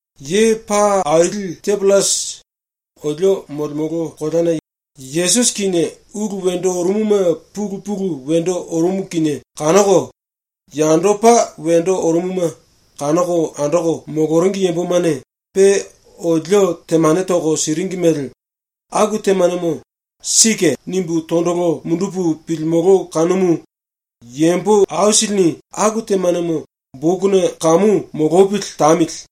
Ye paa aili Tiopillasi, olio molemolo koleana Yesusi kinie ulu wendo orumuma pulu pulu wendo orumu kinie kanoko, yandopa wendo orumuma kanoko andoko moloringi yambomane pe olio temane toko siringi mele, aku temanemo “Sike.” nimbu tondolo mundupu pilimolo kanumu yambo aisilini ‘Aku temanemo bokuna kamu molopili tamili.’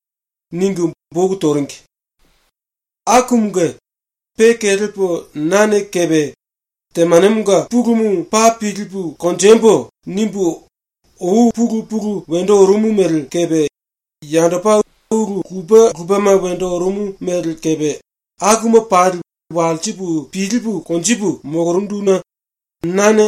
ningu boku toringi. Akumunge pe kelepo nane kepe ‘ ‘Temanemonga pulumu paa pilipu konjembo.’ nimbu ou pulu pulu wendo orumu mele kepe yandopa ulu lupe lupema wendo orumu mele kepe akuma pali walsipu pilipu konjipu molorunduna nane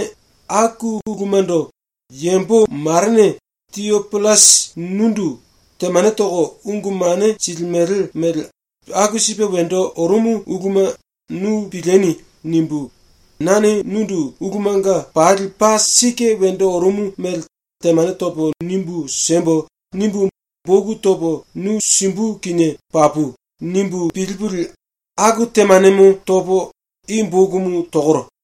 ‘Aku ulumando yambo marene Tiopillasi nundu temane toko ungu mane silimele mele aku sipe wendo orumu uluma nu pilieni.’ nimbu, ‘Nane nundu ulumanga pali paa sike wendo orumu mele temane topo nimbu siembo.’ nimbu, boku topo nu simbu kinie papu.’ nimbu pilipulie aku temanemo topo i bokumu tokoro.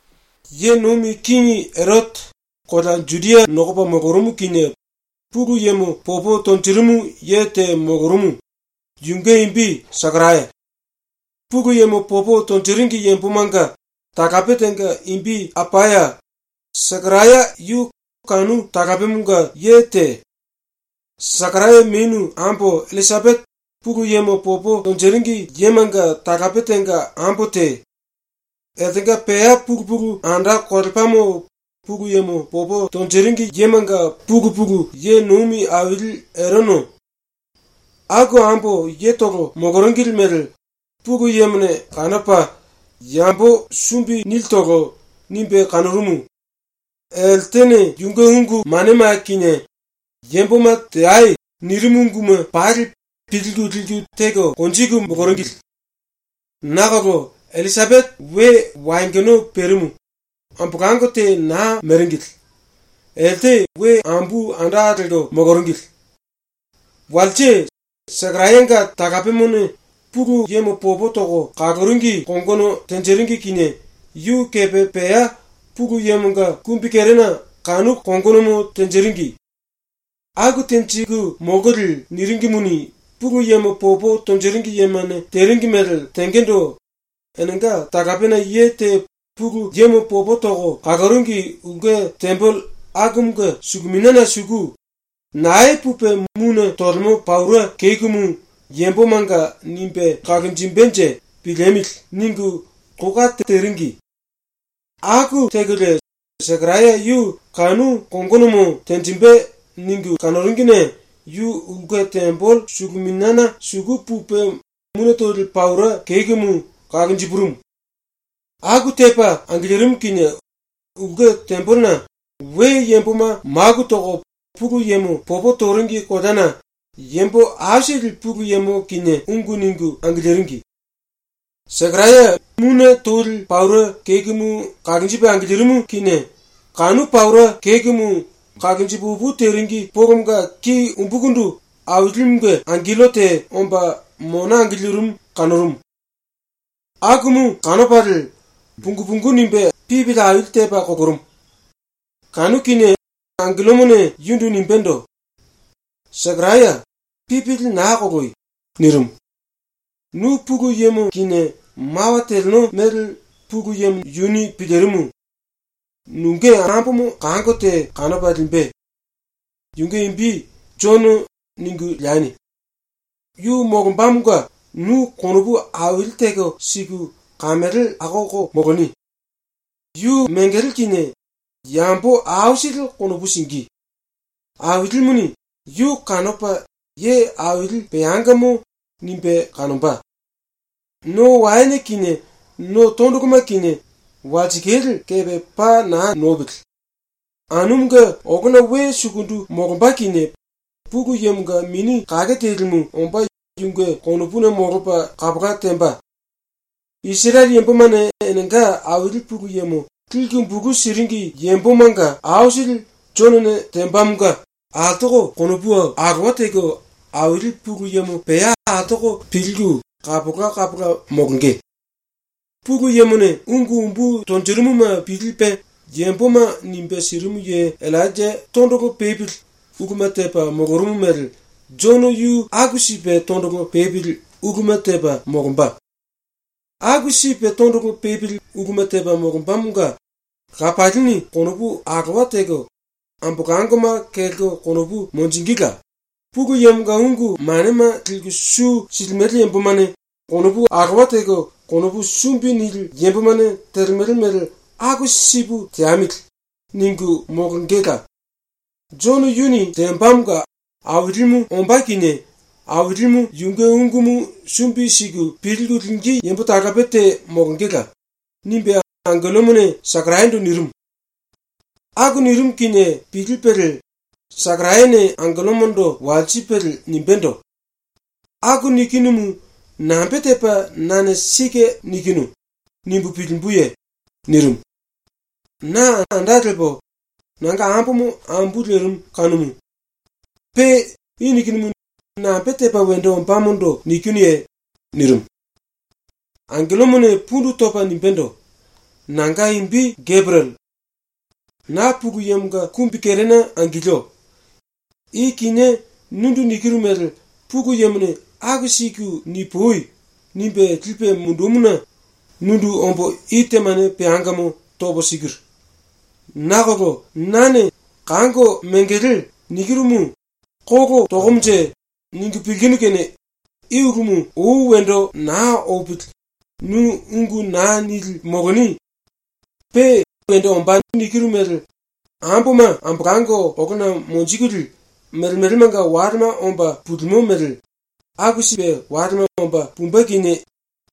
Ye Nomi Kingi Erote kolea Judia nokopa molorumu kinie Pulu Yemo popo tonjirimu ye te molorumu, yunge imbi Sekaraya. Pulu Yemo popo tonjiringi yambomanga talape tenga imbi Apaya, Sekaraya yu kanu talapemonga ye te. Sekaraya menu ambo Illisapete Pulu Yemo popo tonjiringi yemanga talape tenga ambo te. Eltenga pea pulu pulu anda kolepamo Pulu Yemo popo tonjiringi yemanga pulu pulu ye nomi aili Erono. Aku ambo yetolo moloringili mele Pulu Yemone kanopa ‘Yambo sumbi nilitolo.’ nimbe kanorumu. Eltene yunge ungu manema kinie “Yamboma teai.” nirimu unguma pali pilku liku teko konjiku moloringili. Nakolo Illisapete we wayongono perimu, ambolango te naa meringili. Elte we ambu anda lelko moloringili. Walse Sekarayanga talapemone Pulu Yemo popo toko kaloringi kongono tenjiringi kinie yu kepe pea Pulu Yemonga kumbikerena kanu kongonomo tenjiringi. Aku tenjiku molkolie niringimuni, Pulu Yemo popo tonjiringi yemane teringi mele tengendo enenga talapena ye te Pulu Yemo popo toko kaloringi ulke tembele akumunge suluminiana suku ‘Nae pupe mune tolemo paura kekumu yambomanga nimbe kalonjimbenje piliemili.’ ningu kou kate teringi. Aku tekolie ‘Sekaraya yu kanu kongonomo tenjimbe.’ ningu kanoringine yu ulke tembele suluminiana suku pupe mune toli paura kekumu kalonjipurumu. Aku tepa angilirimu kinie ulke tembelena we yamboma maku toko Pulu Yemo popo toringi koleana yambo aisili Pulu Yemo kinie ungu ningu angiliringi. ⸤Sekaraya mune toli paura kekumu kalonjipe angilirimu kinie⸥ kanu paura kekumu kalonji pu opu teringi polomonga ki umbukundu Ailimunge angello te omba mona angilirimu kanorumu. Akumu kanopalie pungu pungu nimbe pipili aili tepa kolorumu. Kanu kinie angellomone yundu nimbendo: “Sekaraya, pipili naa koloi.” nirimu. “Nu Pulu Yemo kinie mawa teleno mele Pulu Yemo yuni pilirimu. Nunge ambomo kango te kanopa limbe. Yunge imbi “Jono” ningu leani. Yu molombamonga nu konopu aili teko siku kamele akoko moloni. Yu mengele kinie yambo aisili konopu singí. Ailimuni yu kanopa ye aili peangamo nimbe kanomba. No waene kinie no tondoloma kinie walsikale kepe paa naa nopili. Anumunge olona we sukundu molomba kinie Pulu Yemonga Mini Kake Telimu omba yunge konopuna molopa kapola temba. “Isirele yambomane enenga Aili Pulu Yemo liku bulu siringi yambomanga aisili Jonone tembamonga altoko konopu alowa teko Aili Pulu Yemo pea altoko pilku kapola kapola molonge. ⸤Pulu Yemone ungu umbu tonjirimuma pilipe yamboma nimbe sirimu ye⸥ Illainja tondolo pepili uluma tepa molorumu mele Jono yu aku sipe tondolo pepili uluma tepa molomba. Aku sipe tondolo pepili uluma tepa molombamonga lapalini konopu alowa teko ambolangoma kelko konopu monjingíla; Pulu Yemonga ungu manema liku su silimele yambomane konopu alowa teko, konopu sumbi nili yambomane telemele mele ‘Aku sipu teamili.’ ningu molongela; Jono yuni tembamonga Ailimu ombá kinie Ailimu yunge ungumu sumbi siku pilku lingí yambo talape te molongela.” nimbe angellomone Sekarayando nirimu. Aku nirimu kinie pilipelie Sekarayane angellomondo walsipelie nimbendo: “Aku nikinumu nambe tepo nane ‘Sike nikinu.’ nimbu pilimbuye?” nirimu. “Na anda lepo nanga ambomo ambu lerimu kanumu. Pe i nikinumu nambe tepa wendo ombamondo nikinuye?” nirimu. Angellomone pundu topa nimbendo: “Nanga imbi Geperiele. Na Pulu Yemonga kumbikerena angilio. I kinié nundu nikiru mele Pulu Yemone “Aku siku nipui.” nimbe lipe mundumuna nundu ombo i temane peangamo topo sikiru. Nakolo nane “Kango mengele.” nikirumu ‘Kolo tokomonje?’ ningu pilkinu kene i ulumu ou wendo naa opili nu ungu naa nili moloni. Pe “Wendo ombá.” nikiru mele amboma ambolango olona monjikulie melemelemanga walema omba pulimo mele aku sipe walema omba pumbe kinie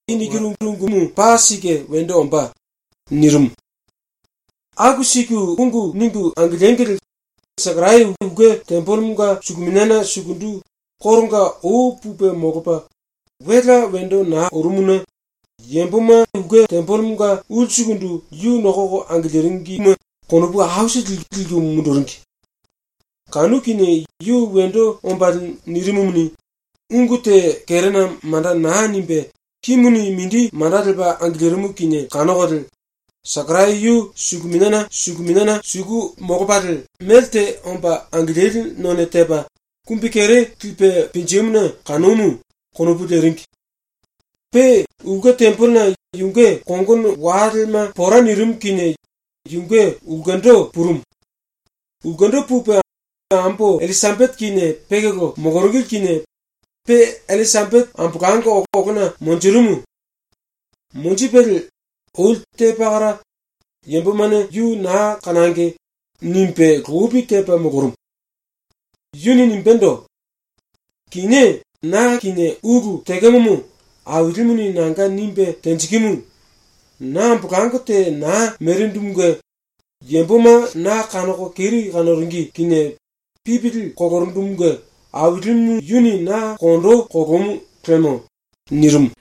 i nikiru ungumu paa sike wendo ombá.” nirimu. Aku siku ungu ningu angiliengili Sekaraya ulke tembelemonga suluminiana sukundu koronga ou pupe molopa, welea wendo naa orumuna yamboma ulsukundu yu nokoko angiliringime konopu aisili liku munduringi. Kanu kinie yu wendo ombalie nirimumuni, ungu te kerena manda naa nimbe kimuni mindi manda lepa angilirimu kinie kanokolie, ‘Sekaraya yu suluminiana suku molopalie melte omba angilili none tepa kumbikere lipe pinjimuna kanomu.’ konopu leringi. Pe ulke tembelena yunge kongono walema pora nirimu kinie yunge ulkendo purumu. Ulkendo pupe ⸤ambo Illisapete kinie pekolo moloringili kinie⸥ pe Illisapete ambolango olona monjirimu. Monjipelie oli te pakara ‘Yambomane yu naa kanangi.’ nimbe lopi tepa molorumu. Yuni nimbendo: “Kinié na kinie ulu tekemomo Ailimuni nanga nimbe tenjikimu. Na ambolango te naa merindumunge yamboma na kanoko keri kanoringi kinie pipili kolorundumunge Ailimu yuni na kondo kolomu lemo.” nirimu.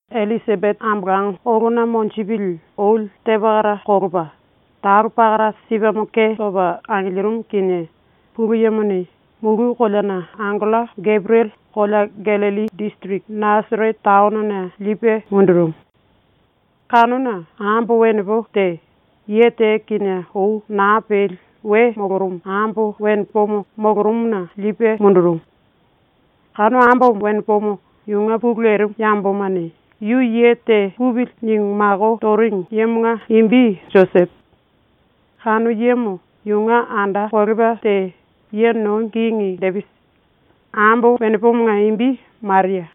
⸤Illisapete ambolango olona monjipili oli te pakara kolopa⸥ talo pakara sipemo ke topa angilirimu kinie Pulu Yemone mulu koleana angello Geperiele kolea Gallilli disiriki Nasarete taonona lipe mundurumu. Kanuna ambo wenepo te, ye te kinie ou naa peli we molorumu ambo wenepo te molorumuna mundurumu. Kanu ambo wenepomo yunge pulu lerimu yambomane ‘Yu ye te pupili.’ ningu mako toringi yemonga imbi Josepo. Kanu yemo yunge anda kolepa te ⸤ye nomi kingi⸥ Depisi. Ambo wenepomonga imbi Maria.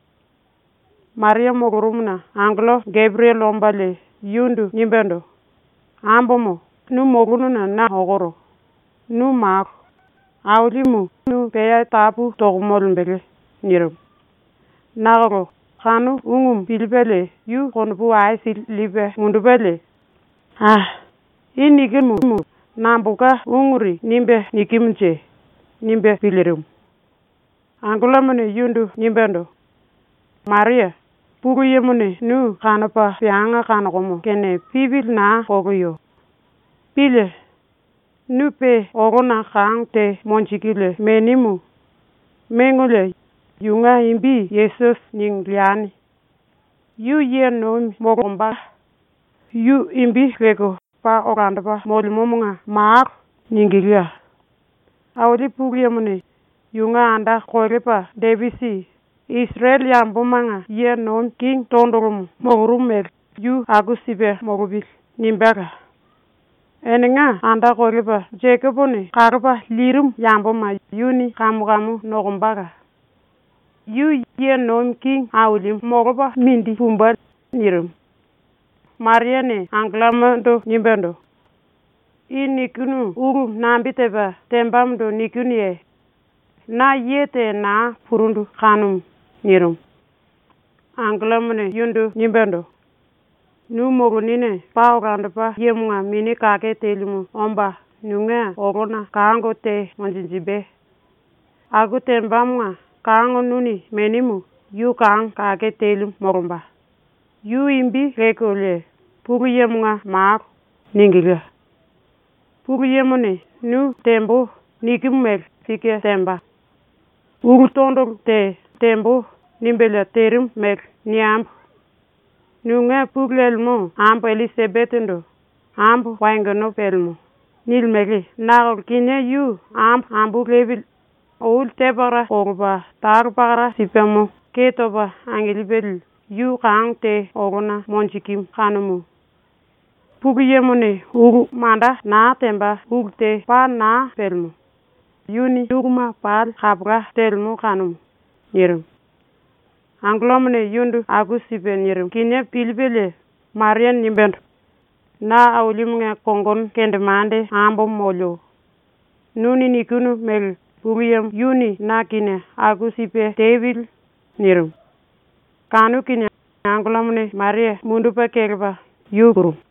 Maria molorumuna angello Geperiele ombalie yundu nimbendo: “Ambomo, nu molonuna na okoro. Nu malo. Ailimu nu pea tapu toko molembele.” nirimu. Nakolo kanu ungumu pilipelie yu konopu aisili lipe mundupelie, ‘A! I nikimumu nambolka unguri nimbe nikimunje?’ nimbe pilirimu. Angellomone yundu nimbendo: “Maria, Pulu Yemone nu kanopa peanga kanokomo kene pipili naa koloyo. Pílie. Nu pe olona kango te monjikulie menimu. Mengolie yunge imbi “Yesusi” ningu leani. Yu ye nomi molomba, yu imbi lelko ‘Paa Olandopa Molemomonga Malo.’ ningíla; Aili Pulu Yemone ‘Yunge anda kolepa Depisi Isirele yambomanga ye nomi kingi tondolomo molorumu mele yu aku sipe molopili.’ nimbéla; Enenga anda kolepa Jekopone kalopa lirimu yamboma yuni kamu kamu nokombala; Yu ye nomi kingi ailimu molopa mindi pumbe.” nirimu. Mariane angellomondo nimbendo: “I nikinu ulumu nambe tepa tembamondo nikinuye? Na ye te naa purundu kanumu.” nirimu. Angellomone yundu nimbendo: “Nu molonine Paa Olandopa Yemonga Mini Kake Telimu omba nunge olona kango te monjinjimbe. Aku tembamonga kango nuni menimu yu kango kake telimu molomba; yu imbi lelkolie ‘Pulu Yemonga Malo’. ningíla. ⸤Pulu Yemone nu “Tembo.” nikimu mele sike temba. Ulu tondolo te “Tembo.” nimbelie terimu mele niembo.⸥ Nunge pulu lemo ambo Illisapetendo “Ambo wayongono pelemo.” nilimele nakolo kinié yu ambo ambu lepili oli te pakara kolopa talo pakara sipemo ke topa angilipili yu kango te olona monjikimu kanumu. Pulu Yemone ulu manda naa temba ulu te paa naa pelemo. Yuni uluma pali kapola telemo kanumu.” nirimu. ⸤Angellomone yundu aku sipe nirimu kinie pilipelie⸥ Mariane nimbendo: “Na Ailimunge kongono kendemande ambomo molio. Nuni nikinu mele Pulu Yemo yuni na kinie aku sipe tepili.” nirimu. Kanu kinie angellomone Maria mundupe kelepa yu purumu.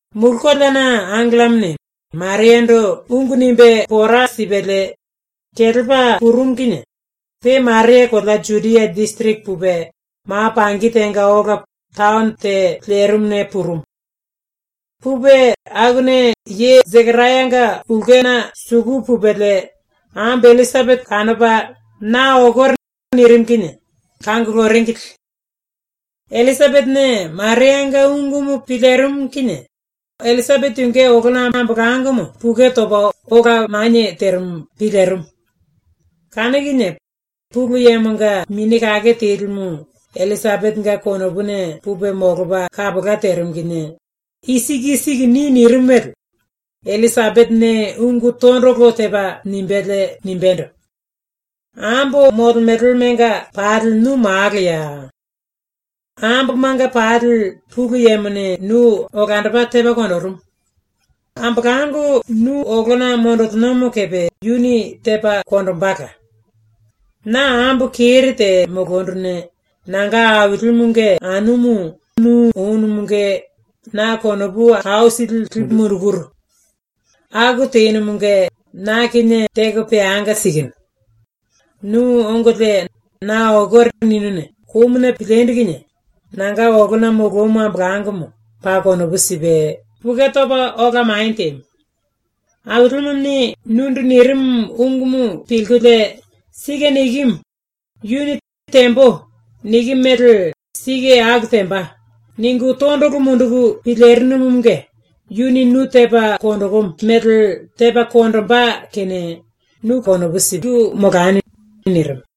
⸤Mulu koleana angellomone Mariando ungu nimbe pora sipelie kelepa purumu kinie⸥ pe Maria kolea Judia disiriki pupe ma pangi tenga ola taono te lerimuna purumu. Pupe akuna ye Sekarayanga ulkena suku pupelie ambo Illisapete kanopa “Na okoro.” nirimu kinie kanguluringili. Illisapetene Marianga ungumu pilirimu kinie Illisapete yunge olona ambolangomo pukue topa ola manie terimu pilirimu. Kanu kinie Pulu Yemonga Mini Kake Telimu Illisapetenga konopuna pupe molopa kapola terimu kinie “I siku i siku ni.” nirimu mele Illisapetene ungu tondolo tepa nimbelie nimbendo: “Ambo molemelemanga pali nu malo. Ambomanga pali Pulu Yemone nu olandopa tepa konjirimu. Ambolango nu olona monjilinomo kepe yuni tepa konjimbela. Na ambo keri te molonduna nanga Ailimunge anumu nu onumunge na konopu aisili lipu mundukuru. Aku tenumunge na kinie teko peanga sikinu. Nu ongolie “Na okoro.” ninuna komuni pilindu kinie nanga olona molomu ambolangomo paa konopu sipe pukue topa ola manie temu. Ailimuni nundu nirimu ungumu pilkulie ‘Sike nikimu. Yuni “Tembo.” nikimu mele sike aku temba.’ ningu tondolo munduku pilirinumunge yuni nu tepa konjikimu mele tepa konjimbe kene nu konopu siku molani.” nirimu.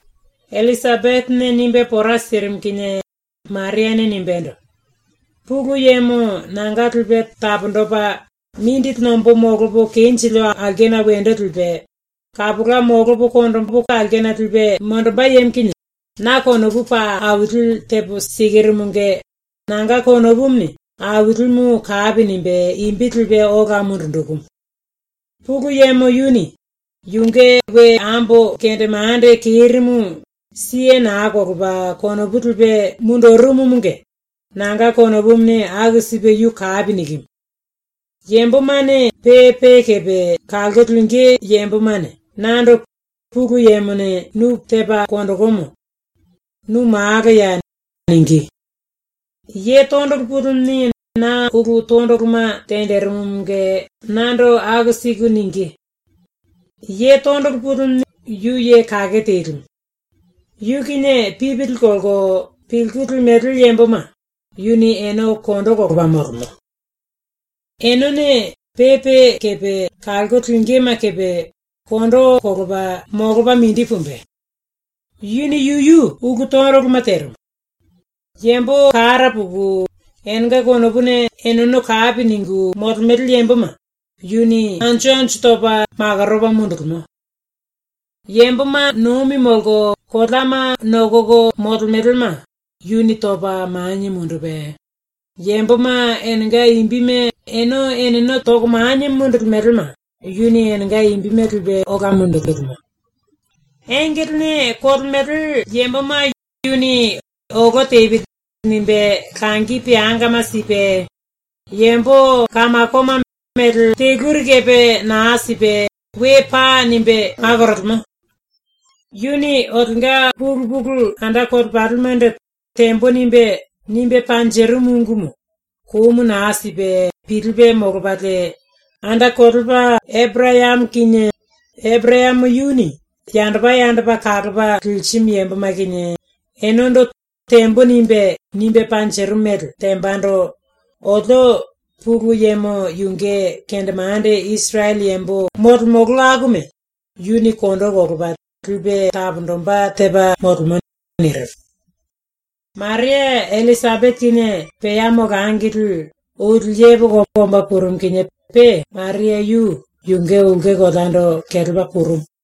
Illisapetene nimbe pora sirimu kinie Mariane nimbendo: “Pulu Yemo nanga Lipe Taponjipe, Mindili Nombo Molopo Kenjilio Aulkena Wendo Lipe, Kapola Molopo Molopo Konjimbu Aulkena Lipe Monjimbe Yemo kinie na konopu paa aili tepo sikirumunge nanga konopumuni Ailimu kapi nimbe imbi ambolopa ola linjikimu. Pulu Yemo yuni yunge we ambo kendemande kerimu siye naa kolopa konopu lipe mundurumumunge nanga konopumuni aku sipe yu kapi nikimu. Yambomane pe pe kepe kalko lingí yambomane nando “Pulu Yemone nu tepa konjikimu. Nu malo.” ningí. Tondolo Pulimuni na ulu tondoloma tenjirimumunge nando aku siku ningí. Tondolo Pulimu yu ye kake telimu. Yu kinie pipili kolko pilku limele yamboma yu kondo kolopa molemo. Enene pe pe kepe kalko lingíme kepe kondo kolopa molopa mindi pumbe. Yuni yuyu ulu tondoloma terimu. Yambo kara puku enenga konopuna eneno kapi ningu molemele yamboma yuni anju anju topa makoropa mundulimo. Yamboma nomi molko koleama nokoko molemelema yuni topa manie mundupe, yamboma enenga imbime ene eneno topa manie mundumbema yuni enenga imbime ambolopa ola linjilimo. Engelene kolemele yamboma yuni ‘Olo tepili.’ nimbe langi peangama sipe, yambo kamakoma mele teluri kepe naa sipe “We pai.” nimbe makorolemo. Yuni olionga pulu pulu anda kolepalimendo “Tembo.” nimbe, nimbe panjirimu ungumu komu naa sipe pilipe molopalie, ⸤anda kolepa⸥ Eporayamo kinie, Eporayamo yuni yandopa yandopa kalopa lirimu yamboma kinie, enendo “Tembo.” nimbe, nimbe panjirimu mele tembando olio Pulu Yemo yunge kendemande Isirele yambo molemolo akuma yuni kondo kolopa lipe taponjimbe tepa molemo.” nirimu. Maria Illisapete kinie pea molangili oli yepoko omba purumu kinie pe Maria yu yunge ulke koleando kelepa purumu.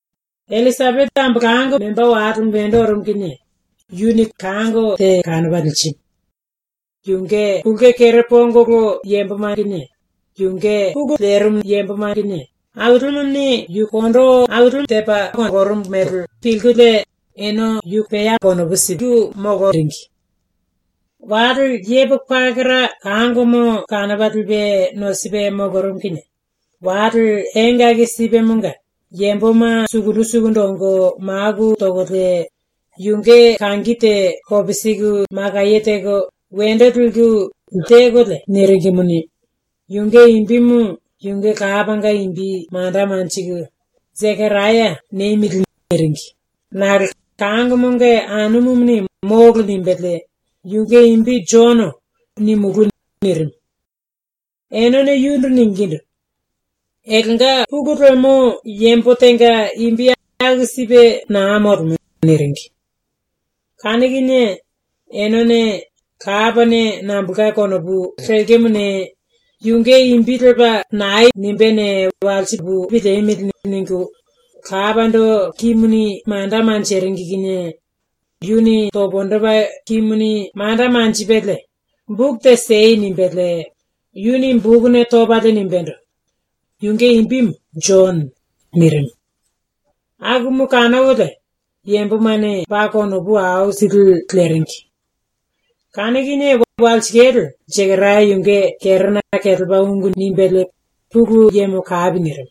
Illisapete ambolango memba walemo wendo orumu kinie yuni kango te kanopa lirimu. Yunge ulke kere pongolo yamboma kinie yunge pulu lerimu yamboma kinie Ailimuni yu kondo aili tepa kolorumu mele pilkulie ene yu pea konopu siku moloringi. Wale yepoko pakara kangomo kanopa lipe nosipe molorumu kinie wale engaki sipemonga yamboma sukundu sukundu ongo maku tokolie yunge kangi te kopisiku makaye teko wendo liku ele tekolie niringimuni, yunge imbimu yunge lapanga imbi manda lelko “‘Sekaraya’ niemili.” niringi nakolo kangomonga anumuni “Molo.” nimbelie “Yunge imbi ‘Jono’ nimulú.” nirimu. Enene yundu ningindu: “Eltenga pulu lemo yambo tenga imbi aku sipe naa molemo.” niringi. Kanu kinie enene “Lapane nambolka konopu lekemone, yunge imbi lepa nae nimbéne, walsipu piliemili.” ningu lapando kimuni manda leringi kinie yuni pundu topa kimuni manda lepalie “Boku siei.” nimbelie, yuni bokuna topalie nimbendo: “Yunge imbi Jono.” nirimu. Akumu kanokolie yambomane paa konopu aisili leringi. Kanu kinie walsikale Sekaraya yunge kerena kelepa ungu nimbelie Pulu Yemo kapi nirimu.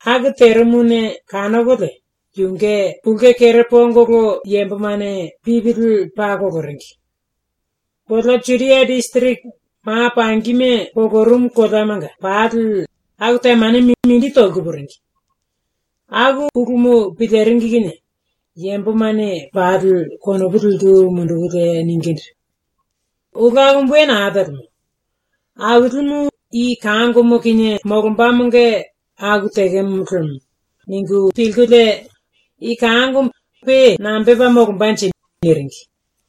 Aku terimuna kanokolie yunge ulke kere pongolo yambomane pipili paa koloringi. Kolea Judia disiriki ma pangima polorumu koleamanga pali aku temanemo mindi toliku puringi. Aku ulumu piliringi kinie yambomane pali konopu liku mundukulie ningindu: “Ulu akumu we naa telemo. Ailimu i kangomo kinie molombamonga aku tekemo lemo.” ningu pilkulie “I kangomo pe nambe tepa molombanje?” niringi.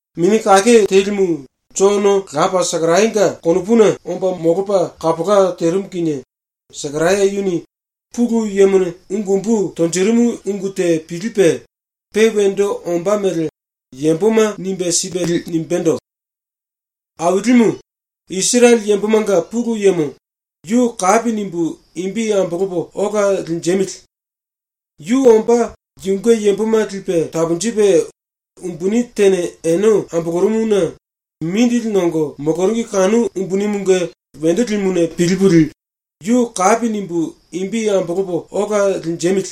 Mini Kake Telimu Jono lapa Sekarayanga konopuna omba molopa kapola terimu kinie Sekaraya yuni Pulu Yemone ungu umbu tonjirimu ungu te pilipe, pe wendo ombá mele yamboma nimbe sipelie nimbendo: “Ailimu, Isirele yambomanga Pulu Yemo, yu kapi nimbu imbi ambolopo ola linjemili. Yu omba yunge yamboma lipe taponjipe umbuni tene ene ambolorumuna mindili nongo moloringi kanu umbunimunge wendo limuna pilipulie aku teamili.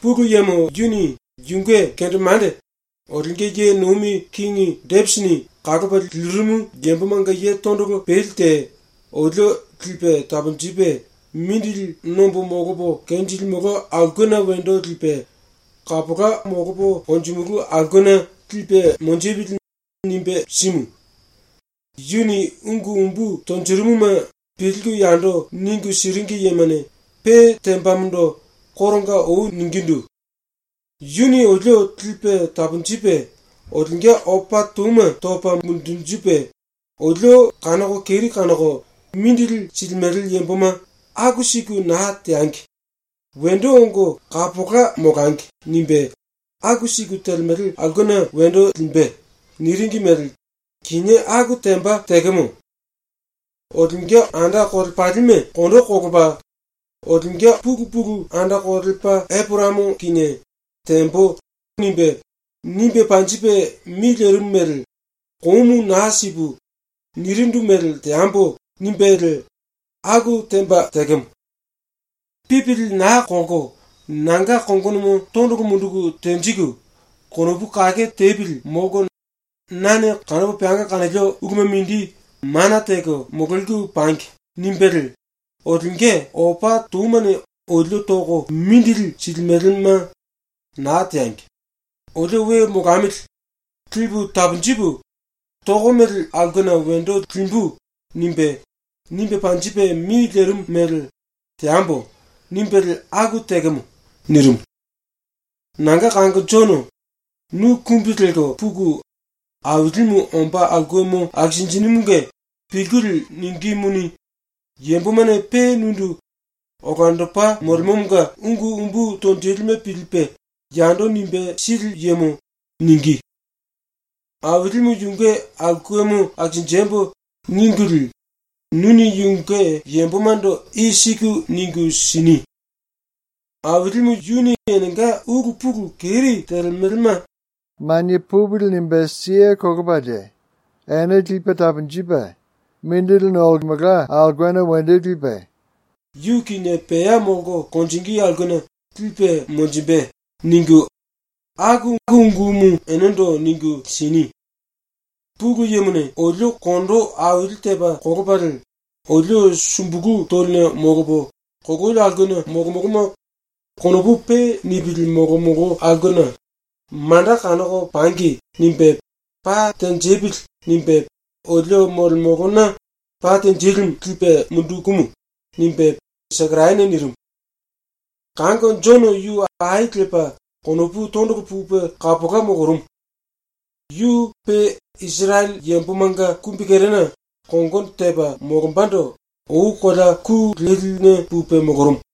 Pulu Yemo yuni yunge kendemande ⸤olionga ye nomi kingi⸥ Depisini kalopa lirimu yambomanga ye tondolo peli te olio ‘Lipe taponjipe mindili nombo molopo kenjilimolo aulkena wendo lipe, kapola molopo konjimulú aulkena lipe monjipili.’ nimbe simu. (Yuni ungu umbu tonjirimuma pilku yando ningu siringi yemane pe tembamondo koronga ou ningindu:) “Yuni olio lipe taponjipe olionga opa touma topa mundunjipe, olio kanoko keri kanoko mindili silimele yamboma ‘Aku siku naa teangi. Wendo ongo kapola molangi.’ nimbe aku siku telemele aulkena wendo limbe.” niringi mele kinié aku temba tekemo. Olionga anda kolepalime kondo kolopa, olionga pulu pulu anda kolepa Eporayamo kinie “Tembo.” nimbe, nimbe panjipe mi lerimu mele “komu naa sipu, nirindu mele teambo.” nimbelie aku temba tekemo. ‘Pipili naa kolko, nanga kongonomo tondolo munduku tenjiku, konopu kake tepili molko nane kanopo peanga kanolio uluma mindi mana teko mololiku pangi.’ nimbelie olionga opa toumane olio toko mindili silimelema ‘Naa teangi. Olio we molamili. Lipu taponjipu tokomele aulkena wendo limbu.’ nimbe, nimbe panjipe mi lerimu mele ‘Teambo.’ nimbelie aku tekemo.” nirimu. “Nanga kango ⸤Jono⸥, nu kumbi lelko puku Ailimu ombá aulkemo akisinjinímunge pilkulie ningímuni, yambomane pe nundu ‘Olandopa Molemomonga ungu umbu tonjilime pilipe yando nimbe sili yemo.’ ningí. ‘Ailimu yunge aulkemo akisinjembo.’ ningulie nuni yunge yambomando i siku ningu sini: “Ailimu yuni enenga ulu pulu keri telemelema ‘Manie pupili.’ nimbe siye kolopalie ene lipe taponjipe mindili nolemelka aulkena wendo lipe, yu kinie pea molko konjingí aulkena lipe monjimbe.” ningu, aku ungumu enendo ningu sini. Pulu Yemone olio kondo aili tepa kolopalie olio sumbulu toline molopo kololi aulkena molomoloma konopu pe nipili molomolo aulkena ‘Manda kanoko pangi.’ nimbe ‘Pa tenjipili.’ nimbe olio molemolona pa tenjilimu lipe mundukumu.” nimbe Sekarayane nirimu. Kango Jono yu ai lepa konopu tondolo pupe kapola molorumu. Yu pe Isirele yambomanga kumbikerena kongono tepa molombando ou kolea ku leline pupe molorumu.